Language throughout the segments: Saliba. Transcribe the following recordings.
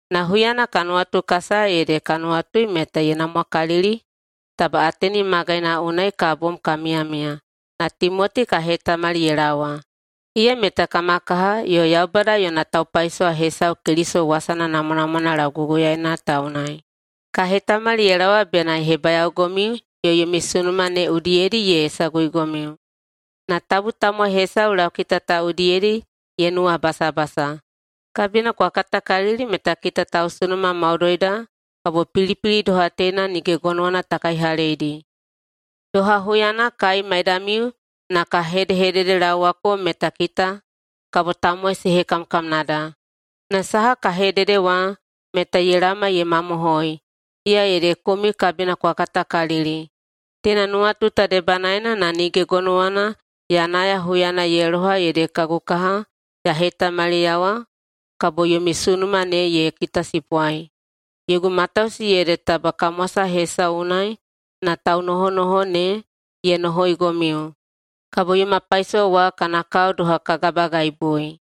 Na huyana ka nuwatukasaya ede ka nuwatui meta ye namwakalili taba Ateni magaina unai ka bom ka miyamiya na Timoti ka hetamali ye laowa. Iya meta kama kaha yo Yaubada yona taupaisowa hesau Keliso wasana namwanamwana lauguguyaeina ta unai. Ka hetamali ye laowa bena ye hebayaogomiu yo yomi sunuma ne udiyedi ye saguigomiu na tabu tamowai hesau laukita ta udiyedi ye nuwabasabasa. Kabina kwa katakalili meta kita tausunuma maudoida kabo pilipili doha teina nige gonowana ta kaihaleidi. Doha huyana kai maidamiu na ka hedehededelaowako meta kita kabo tamowai se hekamkamnada. Na saha ka hedede wa meta ye laoma ye mamohoi, iya ede komiu kabina kwa katakalili. Teina nuwatu ta debanaena na nige gonowana ya naya huyana ye loha ede kagu kaha ya hetamaliyawa kabo yomi sunuma ne ye kitasipwai. Yogu matausi ede taba kamwasa hesau unai na taunohonoho ne ye nohoigomiu, kabo yoma paisowa wa kana kao doha ka gabagaibui.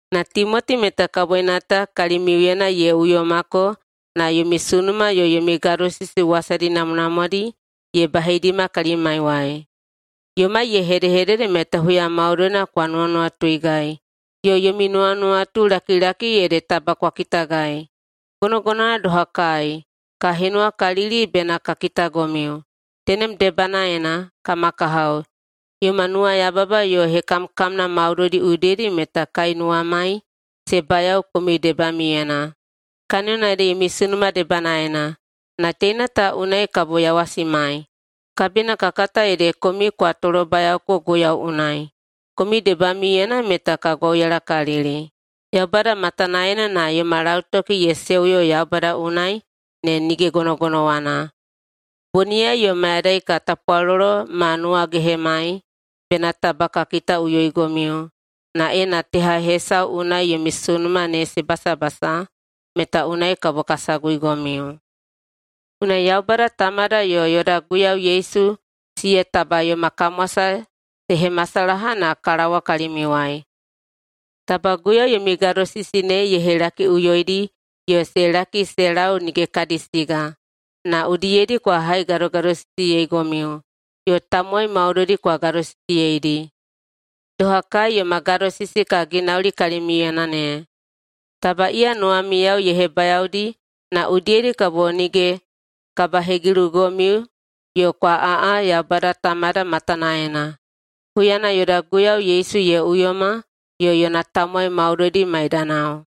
Na Timoti meta kaboina ta kalimiuyena ye uyomako na yomi sunuma yo yomi gadosisi wasadi namwanamwadi ye baheidima kalimaiwai. Yomai ye hedehedede meta huya maudoina kwa nuwanuwatuigai yo yomi nuwanuwatulakilaki ede taba kwa kitagai, gonogonowana doha kai, ka henuwakalili bena ka kitagomiu. Tenem debanaena, kama kahao, yoma nuwayababa yo hekamkamna maudoidi udiyedi meta kai nuwamai se bayao komiu debamiuyena, kaniyona ede yomi sunuma debanaena. Na teina ta unai kabo yawasimai, kabina ka kata ede komiu kwa tolobayaoko Guiyau unai. Komiu debamiuyena meta ka gwauyalakalili Yaubada matanaena na yoma lautoki ye seuyo Yaubada unai ne nige gonogonowana. Boniyai yo mayadai ka tapwalolo ma nuwagehemai bena taba ka kitaꞌuyoigomiu na ena teha hesau unai yomi sunuma ne se basabasa, meta unai kabo ka saguigomiu. Unai Yaubada Tamada yo yoda Guiyau Yesu siya taba yoma kamwasa se hemasalaha na ka laowa kalimiuwai. Taba Guiyau yomi gadosisi ne ye helakiꞌuyoidi yo se laki se lau nige kadi siga, na udiyedi kwa haigadogadosisiyeigomiu yo tamowai maudoidi kwa gadosisiyeidi, doha kai yoma gadosisi ka ginauli kalimiuyena ne. Taba iya nuwamiyao ye hebayaodi na udiyedi kabo nige kabahegilugomiu yo kwa aꞌa Yaubada Tamada matanaena, huyana yoda Guiyau Yesu ye uyoma yo yona tamowai maudoidi maidanao.